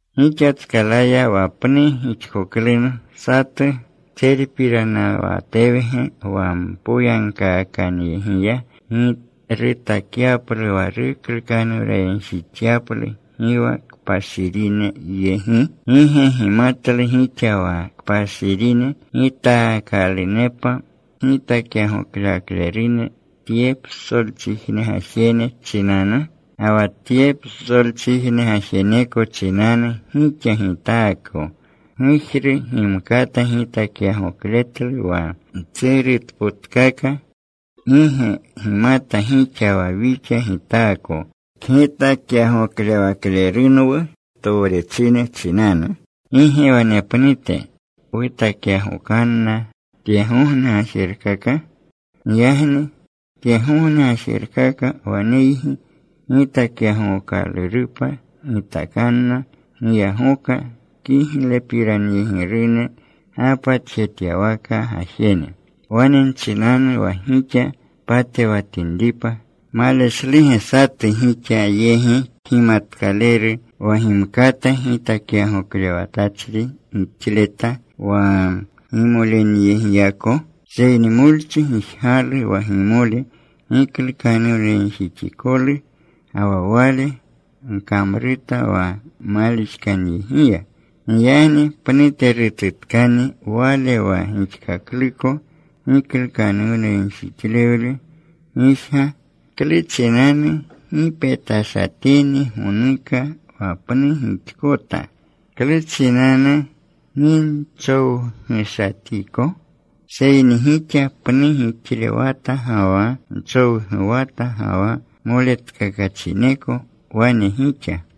Gixatskalaya wa pnu gixkoklunu satu, ¿tserpiranawatewge wa mpoyagkaakanyegiya rutakyaplu wa ruklukanuwnayegjixyaplu, gi wa kpashirine yegi? ¿Gi ge gimatlu gixa wa kpashirine gitaakalunepa kgitakyagoklewaklerune tye psolchijne gajene chinanu? Ga wa tye psolchijne gajeneko chinanu gixa gitaako, pgujru gimkata gitakyagokletlu wa mtserutpotkaka. ¿Gi ge gimata gixa wa wixa gitaako kgitakyagoklewaklerunwu towrechine chinanu? ¿Gi ge wanepnute wutakyagokanna tyegogne gajerkaka? Giyagni tyegogne gajerkaka waneygi gitakyagookalurupa, gitakanna giyagoka kiglepiranyegirune gapatjetyawaka gajene. Wane nchinanu wa gixa patewatinripa: ¿Maleshluge satu gixa yegi kgimatkaleru wa gimkata gitakyagoklewatachri gixleta wa gimolenyegiyako? Seyni molchi gijgalu wa gimole giklukanuwnayegjixikolu. Ga wa wale gkamruta wa malixkanyegiya. Giyagni pnuterututkani wale wa gixkakluko giklukanuwnayegjixlewle gijga. ¿Klu chinanu gi petashatini gonuka wa pnu gixkota? ¿Klu chinanu gi nchowgushatiko? Seyni gixa pnu gixlewata, ga wa nchowguwata, ga wa moletkakachineko wane gixa.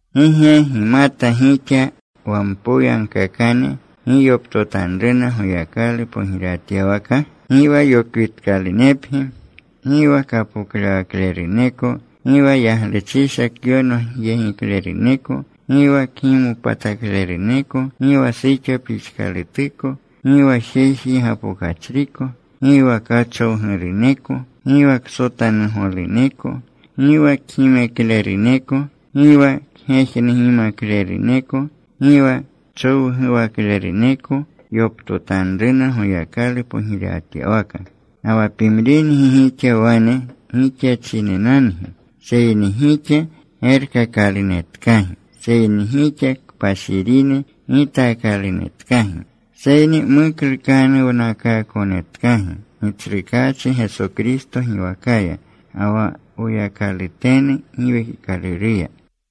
¿Gi ge gimata gixa wa mpoyagkaakane gi yoptotanruna Goyakalu pogirewatyawaka? Gi wa yokwitkalunepgi. Gi wa kapoklewakleruneko, gi wa yagluchisha kyonogyegikleruneko, gi wa kgimopatakleruneko, gi wa suxo pixkalutuko, gi wa jeji gapokachriko. Gi wa kachowguruneko, gi wa ksotanugoluneko, gi wa kgimekleruneko, gi wa kgejnugimakleruneko, gi wa kchowguwakleruneko yoptotanruna Goyakalu pogirewatyawaka. Ga wa pimringi gixa wane gixachinenangi. Seyni gixa gerkakalunetkagi. Seyni gixa kpashirine gitaakalunetkagi. Seyni muklukanuwnakaakonetkagi, Gitsrukaachi Geso Kristo giwakaya, ga wa Woyakalutenu Giwekikaluruya.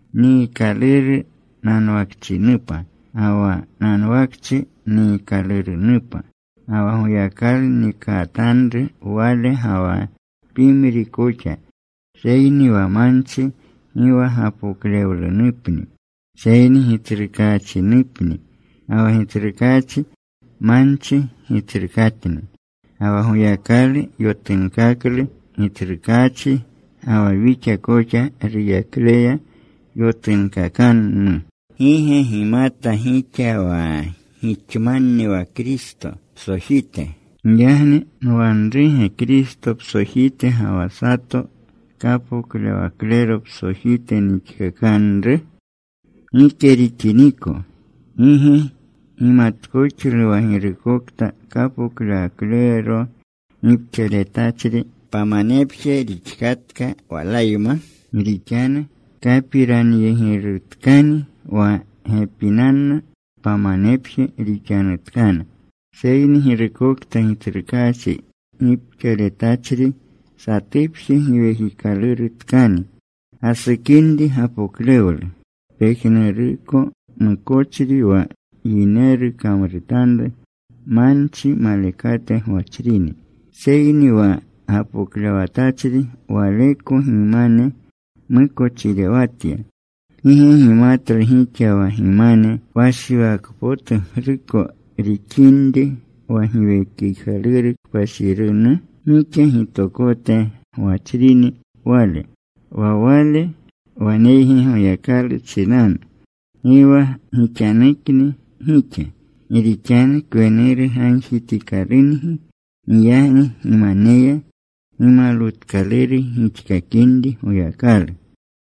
Niikaluru nanwakachinupa, ga wa nanwakchi niikalurunupa. Ga wa Goyakalu nikatanru wale ga wa pimri koxa. Seyni wa manchi gi wa gapoklewlenupni, seyni Gitsrukaachinupni. Ga wa Gitsrukaachi manchi Gitsrukatni. Ga wa Goyakalu yotunkaklu Gitsrukaachi, ga wa wixa koxa ruyakleya yotunkakanu. ¿Gi ge gimata gixa wa gixmanni wa Kristo psojite? Giyagni ¿nwanruge Kristo psojite, ga wa sato kapoklewaklero psojite nixkakanru? Gike rixiniko. ¿Gi ge gimatkoxlu wa girukokta kapoklewaklero gipxaletachri, pamanepje rixatka walayma? Gi rixanu kapiranyegirutkani: Wa gepinanna pamanepje rixanutkana. Seyni girukokta Gitsrukaachi gipxaletachri, satupje giwekikalurutkani. Gasukinri gapoklewlu. Pejnuruko mukochri wa yineru kamrutanru, manchi malekate gwachrini. Seyni wa gapoklewatachri waleko gimane mukochirewatya. ¿Gi ge gimatlu gixa wa gimane kpashiwakpotugruko rixinri wa Giwekikaluru Kpashirinu? Gixa gitokote gwachrini Wale. Wa Wale waneygi Goyakalu chinanu. Gi wa gixanukni gixa. Gi rixanu kwenuru gagjitikalungi. Giyagni gimaneya gimalwutkaluru gixkakinri Goyakalu.